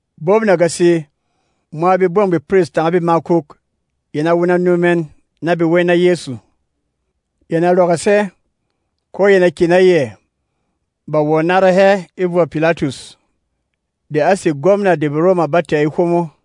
Bop nagasi, mwa begbɔng bepiris tanga bemakuk yɛn a wuna nu mɛn na be wey na Yɛsu. Yɛn a rɔgɔs hɛ, ko yɛn a kyè na yɛ, ba wɔ̀ nára hɛ e vɔ Pilatus, de a sé gwɔmna de BeRoma ba tɛ̀ e hwomo.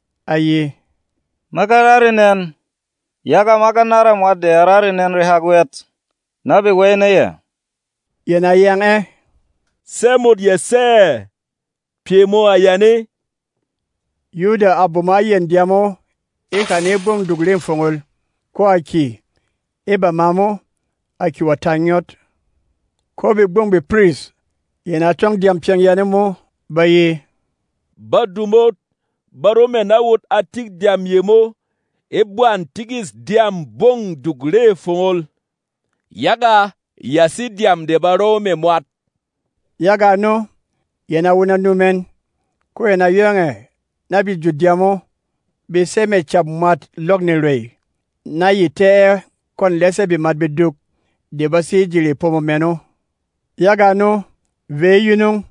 A ye, “Ma ga ra renɛn, yaga ma ga nára mwat de a ra renɛn rehak wɛt, na be wey na yɛ.” Yɛn a yang ɛ, “Sɛ́ mot ya sɛ́ ɛ? Pyɛ mō a yane.” Yuda a bomo a yɛn dyām o e hane e Gbɔng Duk Re Fongol, ko a kyè. E bama mo, a kyè wɔ̀ ta ngyɔt. Ko begbɔng bepiris yɛn a tɔng dyām pyɛng yane mo, ba ye, “Badu mot ba ro mɛ̀ na wot a tik dyām yemo e gban tikîs dyâm Gbɔng Duk Re Fongol, yaga ya sé dyām de ba row mɛ̀ mwat.” Yaga ano, yɛn a wuna nu mɛn, ko yɛn a yong ɛ̀ na be jut dyām o, be sey mɛ̀ cap mwât lɔk nerwèy, na ye tɛ́ ɛ kwɔ̂n lɛsɛ̂ bemat beduk de ba sé e ji repomo mɛn o. Yaga ano, vey e yunung,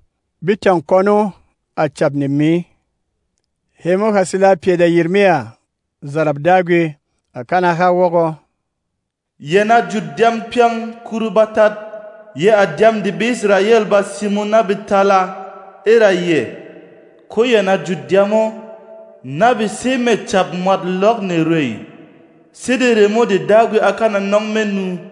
be tâng kwɔn o, à Cap Nemi. Hemo ha sila pyɛ de Yirmiya, zarap Dagwi, à kana ha wɔgɔ, “Yɛn a jut dyām pyɛng kuru batat, yɛ̄ à dyām de BeIsrayɛl ba simo na be tala e ra yɛ̀, ko yɛn a jut dyām o, na be sey mɛ̀ cap mwât lɔk nerwèy, sede remo de Dagwi á kana nɔng me nu.”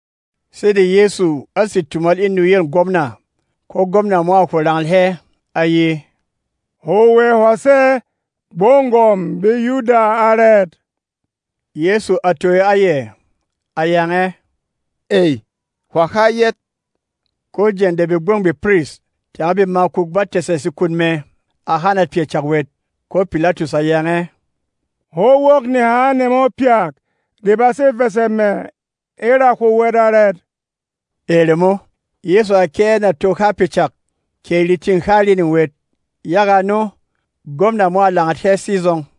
Sede Yɛsu á sè tumal e nuyêl gwɔmna, ko gwɔmna mo a hwo rangal hɛ, a ye, “Hwo wɛ hwà sé Gbɔng Gwɔ̀m BeYuda arɛt?” Yɛsu a toyo a yɛ, a yang ɛ, “Ey, hwà ha yɛt.” Ko jeng de begbɔng bepiris tanga bemakuk ba tɛ̀sɛ sekun mɛ, a hanat pyɛ cak wɛt. Ko Pilatus a yang ɛ, “Hwó wok neha nemo pyak de ba sé vɛ̀sɛ mɛ̀ e ra hwo wɛt arɛt?” E remo, Yɛsu a kyɛ́ ɛ nà to ha pyɛ cak, kɛ retîn há rining wɛt. Yaga ano, gwɔmna mo a langat hɛ sizɔng.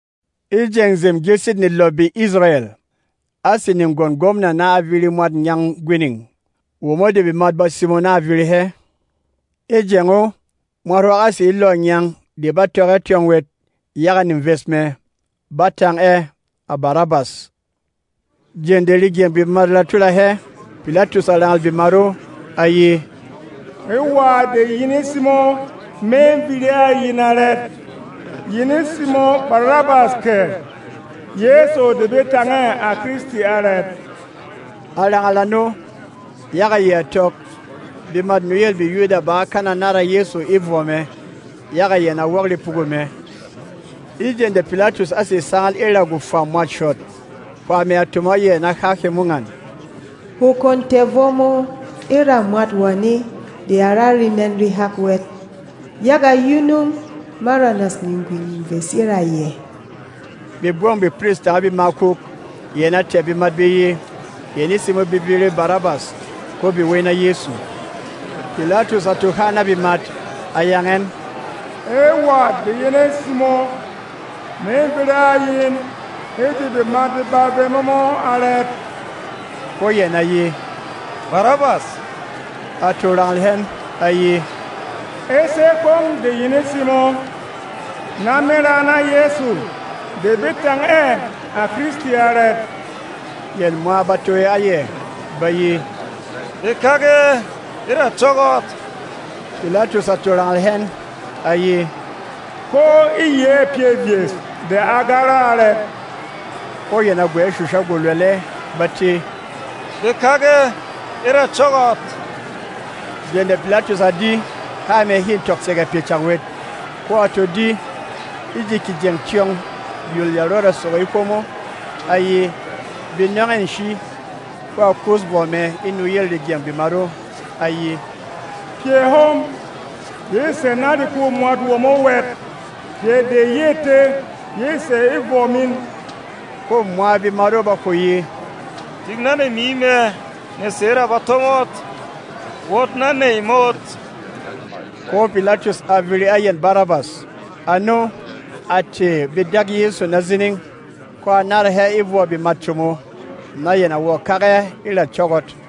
E jeng Nzem Gyilsit Nelɔ BeIsrayɛl, á sè negwɔn gwɔmna na a viri mwât ngyang gwining, womo de bemat ba simo na a viri hɛ. E jeng o, mwat hwak á sè e lɔ̂ ngyang de ba tɔk ɛ tyɔng wɛt yaga neves mɛ; ba tang ɛ, à Barabas. Jeng de regyɛng bemat ra tula hɛ, Pilatus a rangâl bemat o, a ye, “E wà de yin e simo me viri a yin arɛt? Yin e simo Barabas kɛ Yɛsu de be tang ɛ, à Kristi arɛt?” A rangal ano, yaga yɛ a tɔk, bemât nuyêl BeYuda bá kana nára Yɛsu e vɔ mɛ, yaga yɛn a wok repugu mɛ. E jeng de Pilatus á sè sangal e ra gwofwa mwât shɔt, hwā mɛ a tomo a yɛ na há hemo ngan: “Hwo kwon tɛ̀ vɔ mō e ra mwat wane de a ra renɛn rehak wɛt, yaga yunung ma ranas negwi neves e ra yɛ.” Begbɔng bepiris tanga bemakuk yɛn a tɛ̀ bemat be ye, yɛn e simo be viri Barabas, ko be wey na Yɛsu. Pilatus a to ha na bemat, a yang ɛn, “E wà de yin e simo me viri a yin e ji bemat beba vemo mo arɛt?” Ko yɛn a ye, “Barabas!” A to rangal hɛn, a ye, “E sɛ́ kwong de yin e simo na me ra na Yɛsu de be tang ɛ, à Kristi arɛt?” Yɛn mwa ba toyo a yɛ, ba ye, “Bē kak ɛ e ra cɔ́gɔt!” Pilatus a to rangal hɛn, a ye, “Ko e yɛ̌ pyɛ vyes de a ga ra arɛt?” Ko yɛn a gwɛ̌ shusha gwolwɛlɛ, ba tē, “Bē kak ɛ e ra cɔ́gɔt!” Jeng de Pilatus a di, há mɛ hê tɔk sege pyɛ cak wɛt, ko a to di, e ji kejeng tyɔng yol ya rɔda sogo e hwomo, a ye, bē nɔng ɛ nshi, ko a kus vɔ mɛ e nuyêl regyɛng bemat o. A ye, “Pyɛ hom yê sè na rekû mwat womo wɛt! Pyɛ de yê té yê sè e vɔ min!” Ko mwa bemat o ba hwo ye, “Tik na nemi mɛ ne sè e ra bato mot, wot na nèy mot!” Ko Pilatus a viri a yɛn Barabas. Ano, a tɛ̀ be dak Yɛsu na zining, ko a nára hɛ e vɔ bemât como, na yɛn a wɔ̀ kak ɛ e ra cɔ́gɔt.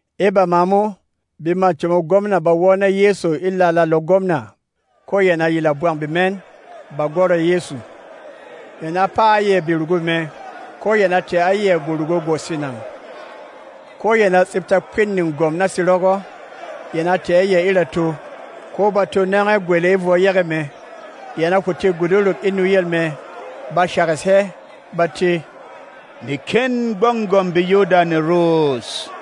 E bama mo, bemât comô gwɔmna ba wɔ́ na Yɛsu e lalâ lɔ gwɔmna, ko yɛn a yila bwang bemɛn, ba gwɔrɔ Yɛsu. Yɛn a paa a yɛ berugu mɛ, ko yɛn a tɛ̀ a yɛ gworugu gwoswinang. Ko yɛn a tsipta kpîn negwɔm na serɔgɔ, yɛn a tɛ̀ a yɛ e rato, ko ba to nɔng ɛ gwele e vwɔ yege mɛ. Yɛn a hwo tē guduruk e nuyel mɛ, ba shɛgɛsh hɛ, ba tē, “Nekên Gbɔng Gwɔ̀m BeYuda ne ros!”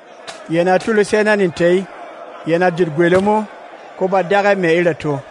Yɛn a tulus hɛ na netey, yɛn a jut gwele mo, ko ba dak ɛ mɛ̀ e rato.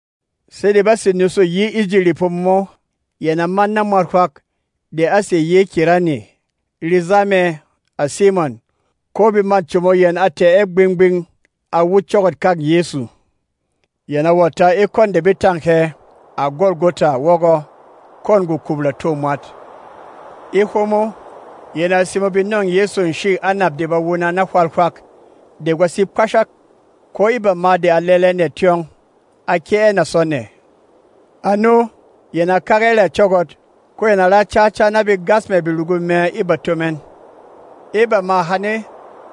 Sede bá sè nusu yi e ji repomo mo, yɛn a man na mwat hwak de á sè yi e Kirene, reza mɛ, à Simɔn. Ko bemât como yɛn a tɛ̀ ɛ gbing-gbing a wut cɔ́gɔt-kâk Yɛsu. Yɛn a wɔ̀ ta e kwɔn de be tâng hɛ, à Gɔlgɔta wɔgɔ, kwɔ̂n gwokup ratô mwat. E hwomo, yɛn a simo be nɔ̂ng Yɛsu nshî anap de ba wuna na hwal hwak de gwa sé kpashak. Ko e bama de a lɛlɛ nɛ tyɔng, a kyɛ́ ɛ nà sɔ nɛ. Ano, yɛn a kak ɛ e ra cɔ́gɔt, ko yɛn a ra cáca na be gas mɛ̀ berugu mɛ e bato mɛn. E bamâ hane,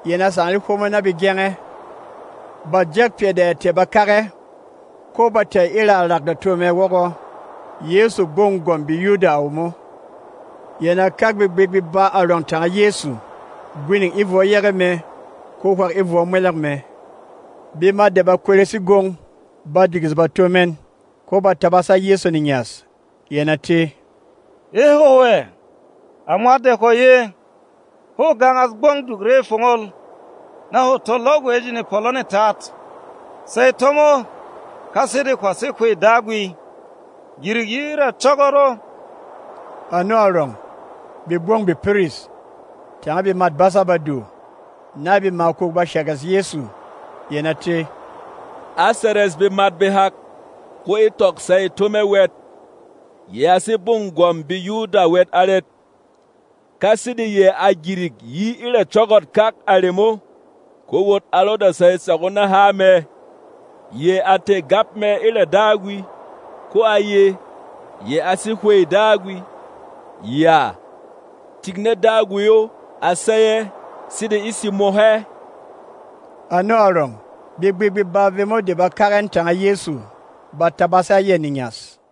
yɛn a sangal e hwomo na be gyeng ɛ. Ba jɛk pyɛ de ya tɛ̀ ba kak ɛ, ko ba tɛ̀ e ra rak rato mɛ wɔgɔ, YƐSU, GBƆNG GWƆM BEYUDA À WOMO. Yɛn a kak begbik beba arɔng tanga Yɛsu, gwining e vwɔ yege mɛ ko hwak e vwɔ mwɛlɛng mɛ. Bemat de ba kweres e gwong ba digis bato mɛn, ko ba tabas a Yɛsu nengyas, yɛn a tē, “E hwo wɛ, à mwat de hwá ye, hwô gangas Gbɔng Duk Re Fongol, na hwo to lɔk wɛ e ji nepɔlɔ netat, sey tó mo! Ka sede hwà sé Hwey Dagwi, gyirik yi e ra cɔ́gɔt o!” Ano arɔng, begbɔng bepiris, tanga bemât basâ Badu, na bemakuk ba shɛgɛsh Yɛsu, yɛn a tē, “Á seres bemat behak, ko e tɔk sey tó mɛ wɛt! Yɛ a sé Gbɔng Gwɔ̀m BeYuda wɛt arɛt? Ka sede yɛ a gyirik yi e ra cɔ́gɔt-kak a remo, ko wot a rɔda sey tsak o na há mɛ! Yɛ a tɛ̀ gap mɛ e ra Dagwi, ko a ye, yɛ a sé Hwey Dagwi. Yàa! Tik na Dagwi o a sey ɛ, sede e simo hɛ!” Ano arɔng, begbik beba vemo de ba kak ɛn tanga Yɛsu ba tabas a yɛ nengyas.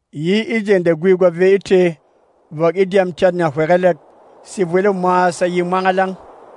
Yi e jeng de gwi gwa vey e tē vɔk e dyām tyat nahywegelek, sevwel o mwa sa ye mwangalang.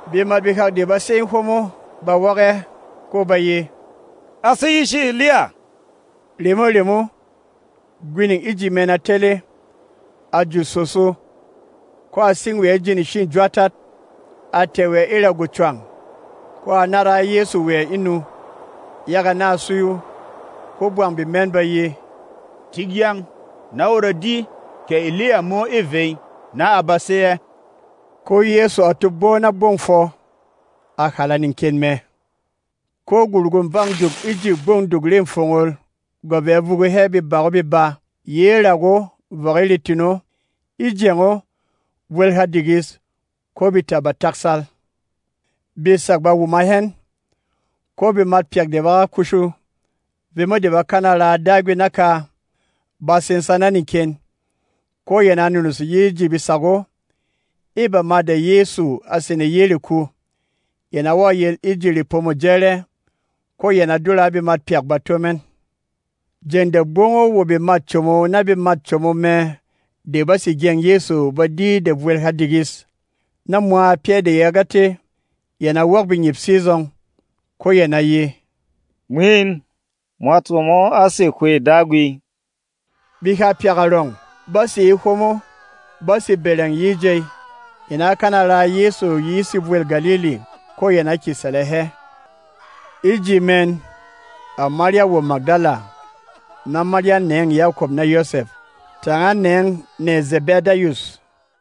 Bemat behak de ba sé e hwomo ba wok ɛ, ko ba ye, “A sé yishi Eliya!” Remo-remo, gwining e ji mɛn a tele, a jut sòso, ko a sing wɛ e ji nshî jwaatat. A tɛ̀ wɛ e ra gwocwang, ko a nára a Yɛsu wɛ e nu, yaga na a suyu. Ko bwang bemɛn ba ye, “Tik yaang, na wot a di kɛ Eliya mo ê vey, na a ba sey ɛ!” Ko Yɛsu a to gbɔ na gbɔng fwɔ, a hàla neken mɛ. Ko gworugû bâng duk e ji Gbɔng Duk Re Fongol gwa vɛ̌ vugu hɛ bebak o beba yi e rak o vɔk e retin o. E jeng o, vwel ha digis, ko beta ba taksal. Besak ba wuma hɛn, ko bemat pyak de ba ga kushu, vemo de bá kana raa Dagwi naka, ba sensa na neken, ko yɛn a nunus yi e ji besak o. E bama de Yɛsu a sene yi e reku, yɛn a wɔ̀ yel e ji Repomô Jɛrɛ, ko yɛn a dura a bemat pyak bato mɛn. Jeng de gbɔng o wo bemât como na bemât como mɛ de ba sé gyeng Yɛsu ba di de vwel ha digis, na mwa pyɛ́ de ya ga té, yɛn a wok bengyip sizɔng, ko yɛn a ye, “Mwin, mwat womo á sè Hwey Dagwi!” Beha pyak arɔng ba sé e hwomo, ba sé bɛrɛng yi e jey. Yɛn á kana raa Yɛsu yi e sevwêl Galili, ko yɛn a kyě sɛlɛ hɛ. E ji mɛn, à Marya wo Magdala, na Marya nêng Yakɔp na Yɔsɛf, tanga nêng nèy Zɛbɛdayus.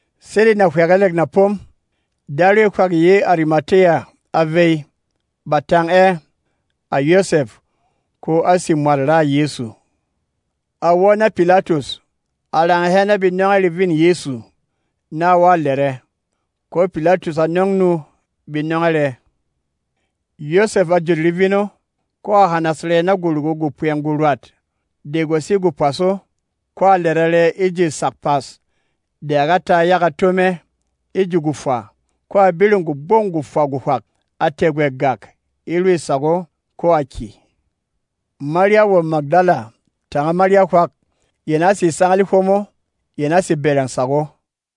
Sede nahywegelek na pom, darwey hwak yi e Arimatiya a vey. Ba tang ɛ, à Yɔsɛf, ko á sè mwât raà Yɛsu. A wɔ́ na Pilatus, a rangal hɛ na be nɔng ɛ revîn Yɛsu, na a wɔ̀ lɛrɛ. Ko Pilatus a nɔng nu be nɔng ɛ rɛ. Yɔsɛf a jut revin o, ko a hanas rɛ na gworugu gwopwɛng gworwat de gwa sé gwopwas o, ko a lɛrɛ rɛ e ji sak pas de a ga ta yaga tó mɛ e ji gwofwa. Ko a biring gwogbɔng gwofwa gwohwak, a tɛ̀ gwɛ gàk e rwi sak o, ko a kyè. Marya wo Magdala tanga Marya hwak yɛn a sé sangal e hwomo, yɛn a sé bɛrɛng sak o.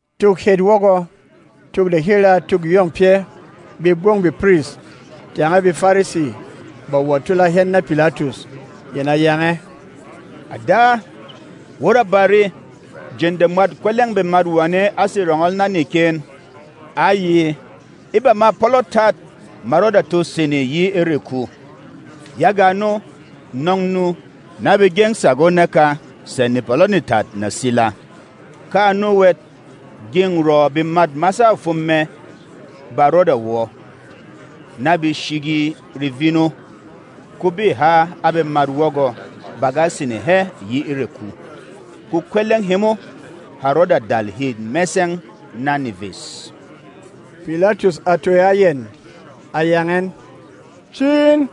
Tuk het wɔgɔ, tuk de he raa tûk yông pyɛ́, begbɔng bepiris tanga BeFarisi ba wɔ̀ tula hɛn na Pilatus. Yɛn a yang ɛ, “À da, wot a bare, jeng de mwât kwɛlɛ̂ng bemat wane á sè rɔngɔl na neken, á ye, ‘E bamâ pɔlɔ tat, ma rɔda to sene yi e reku.’ Yaga ano, nɔng nu, na be gyeng sak o naka sɛ̌ nepɔlɔ netat na sila. Ka ano wɛt, gyeng rɔ̌ bemât masâ fwom mɛ ba rɔda wɔ, na be shigi revin o, ko bê ha a bemat wɔgɔ, ba ga sene hɛ yi e reku. Ko kwɛlɛng hemo ha rɔda dal hê mɛsɛng na neves.” Pilatus a toyo a yɛn, a yang ɛn, “Ci in,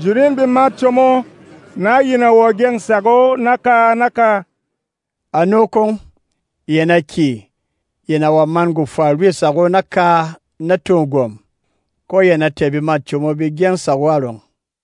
jut in bemât como, na yin a wɔ̀ gyeng sak o naka-naka.” Ano kwong, yɛn a kyè, yɛn a wɔ̀ man gwofwa rwi sak o naka na tô gwɔ̀m, ko yɛn a tɛ̀ bemât como be gyeng sak o arɔng.